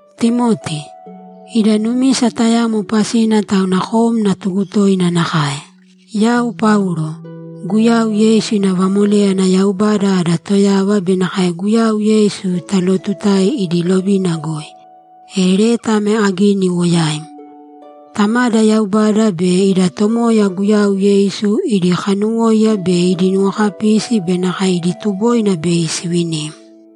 Timoti, Ida numisa tayamo pasina tauna kom natugu toina nakae. Yau Paulo, Guyau Yeisu ina vamoléyana Yaubada ada Toyava be nakae Guyau Yeisu talootutae idi lovina goi. E leta ame agini iwo yaim. Tamada Yaubada be ida Tomoya Guyau Yeisu idi kanuwóiya be idi nuwokapisi be nakae idi tuboina bei sivinim.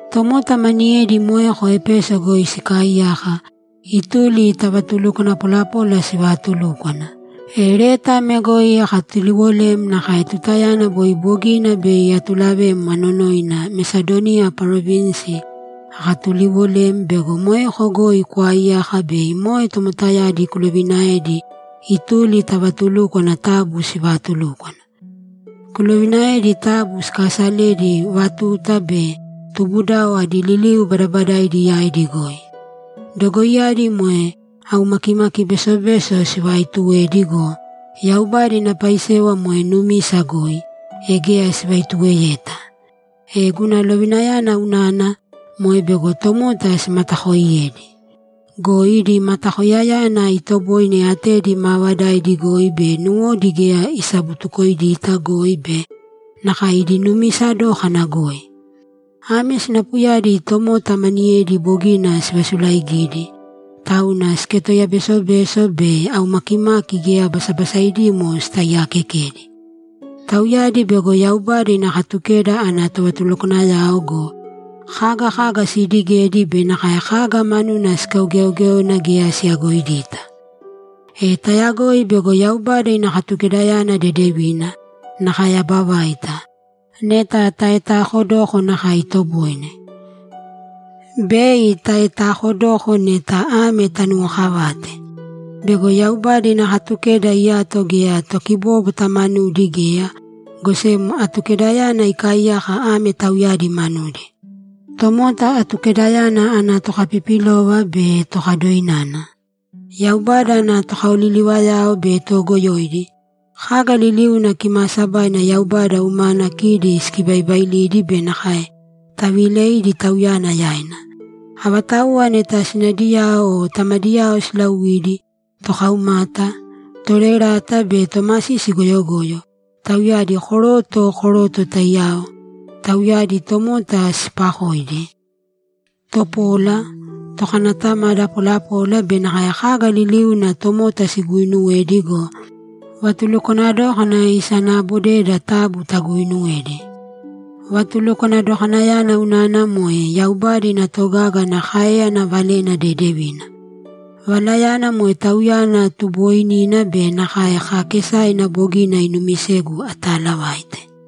Tomota maniyedi moeko Epeso goi sikaaiyaka, ituli ta vatulukwana polapola sivaatulúkwana. E leta ame goi akatuliwolem nakae tutayana boi bogina bei atulavem anonoina Mesadoniya parovinsi akatuliwolem bego moeko goi kwaaiyaka bei moe tomotayadi kulovinaēdi ituli ta vatulúkwana taabu sivaatulūkwana. Kulovinaēdi taabu sikaasalēdi vatuta be tubudao adi liliu badabadaaidi yaidi goi. Dogoiyadi moe aumakimaki besobeso sivaaituwedi go, Yaubada ina paisewa moe numisa goi, e geya sivaituweyeta. E guna lovinayana unana, moe bego tomota simatakooiyedi. Go idi matakoiyana itoboine atedi maavadaidi goi be nuwodi geya isabutukoidita goi be nakae idi numisa dókana goi. Ame sinapuyadi tomota maniyedi bogina sivasulaigidi, tauna siketoiya besobeso be aumakimaki geya basabasaidimo sitaiyakekedi. Tauyadi bego Yaubada ina Katukeda ana tovatulukwanayao go, kaga kaga siidigedi be nakae kaga manuna sikaugeogéona geya siyagoidita. E tayagoi bego Yaubada ina Katukedayana dedevina, nakae aba vaita, neta taetakodoko nakae itoboine. Bei taetakodoko neta ame tanuwokavate: Bego Yaubada ina Katukeda iyato geya tokibóbwata manudi geya, go sem Atukedayana ikaaiyaka ame tauyadi manudi: Tomota Atukedayana ana tokapipilova be tokadoinana, Yaubada ana tokaoliliwoyao be toogoyoidi, kaga liliuna kimaasabaina Yaubada umana kidi sikibaibailidi be nakae taviileidi Tauyana yaina, avatauwa neta sinadiyao o tamadiyao silauidi, tokaumata, toroerata be tomasisi goyogoyo, tauyadi koroto koroto taiyao, tauyadi tomota siipakoidi, topola, tokanatamada polapola be nakae kaga liliuna tomota siguuinuwedi go, vatulukwana dókana isanaabodeda taabu taguuinuwēdi. Vatulukwana dokanayana unana moe Yaubada ina togaga ana káeyana Valena Dedevina. Valayana moe Tauyana tubooinina be nakae kaakesaina bogina inumisegu ataalavaite.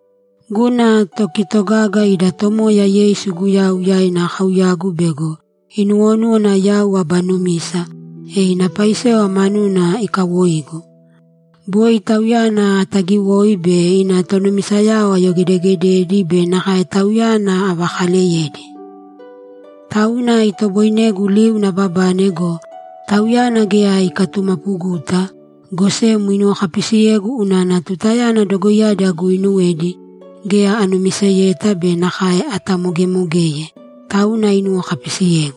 Guna tokitogaga ida Tomoya Yeisu Guyau yaina akauyagu bego inuwonúwana yau aba numisa, e ina paisewa manuna ikawoigu. Boi Tauyana ataagiwoi be ina tonumisayao ayogedeegededi be nakae Tauyana avakaaleyedi. Tauna itoboinegu liuna ababane go, Tauyana geya ikatumapuguta, go sem inuwokapisiyegu unana tutayana dogoiyadi aguinuwedi, geya anumiseyeta be nakae atamogemogeye, tauna inuwokapisiyegu.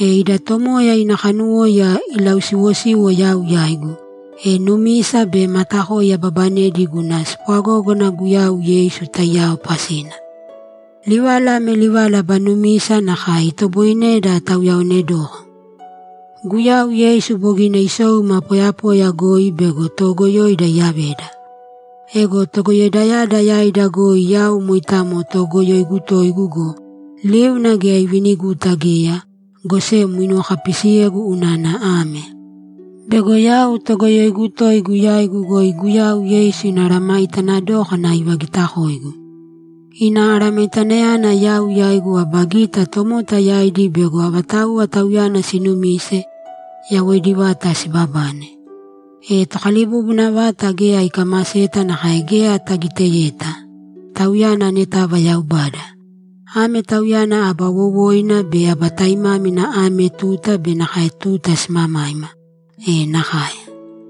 E ida Tomoya ina kanuwóiya ilausiwosiwo yau yaigu, e numisa be matakoi ababanedi guna spwagógana Guyau Yeisu taiyao pasina. Livala ame livala aba numisa nakae itoboineda tauyaonedoko: Guyau Yeisu bogina isou ima poyapoya goi bego toogoyoida iyaveda. Ego togoyoidayada yaida goi yau moitamo toogoyoigu toigu go, liuna geya iviniguta geya, go sem inuwokapisiyegu unana ame: Bego yau toogoyoigu toigu yaigu goi Guyau Yeisu ina aramaitana dókana ivagitakoigu. Ina aramaitanayana yau yaigu aba gita tomota yaidi bego avatauwa Tauyana sinumise, yawoidi vata sibabane. E Tokalibubuna vata geya ikamaseta nakae geya tagiteyeta. Tauyana anetava Yaubada. Ame Tauyana aba wowoina be aba taimámina ame tuta be nakae tuta simamaima. E nakae!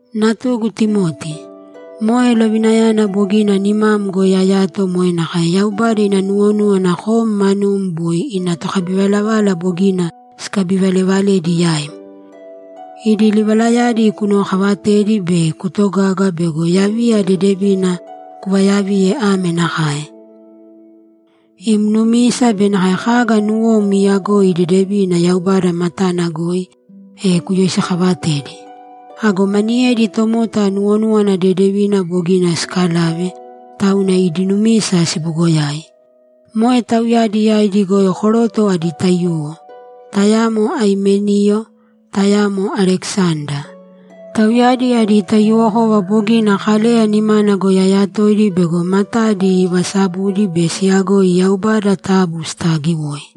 Natugu Timoti, moe lovinayana bogina nimam goi ayato moe nakae Yaubada ina nuwonúwana kom manum boi ina tokabivalavala bogina sikabivalevaledi yaim. Idi livalayadi kunuwokaavatēdi be kuutogāga bego yaviya dedevina kuvayaviye ame nakae: Im numisa be nakae kaga nuwom iiyagoi dedevina Yaubada matana goi, e kuyoisikaavatēdi. Ago maniyedi tomota nuwonúwana dedevina bogina sikalave, tauna idi numisa sibugoyai. Moe tauyadi yaidi goi koroto adi taiyuwo, tayamo Aimeniyo, tayamo Alekisanda. Tauyadi adi taiyuwokova bogina Kaleya nimana goi ayatoidi bego matadi ivasabudi be siyagoi Yaubada taabu sitaagiwōi!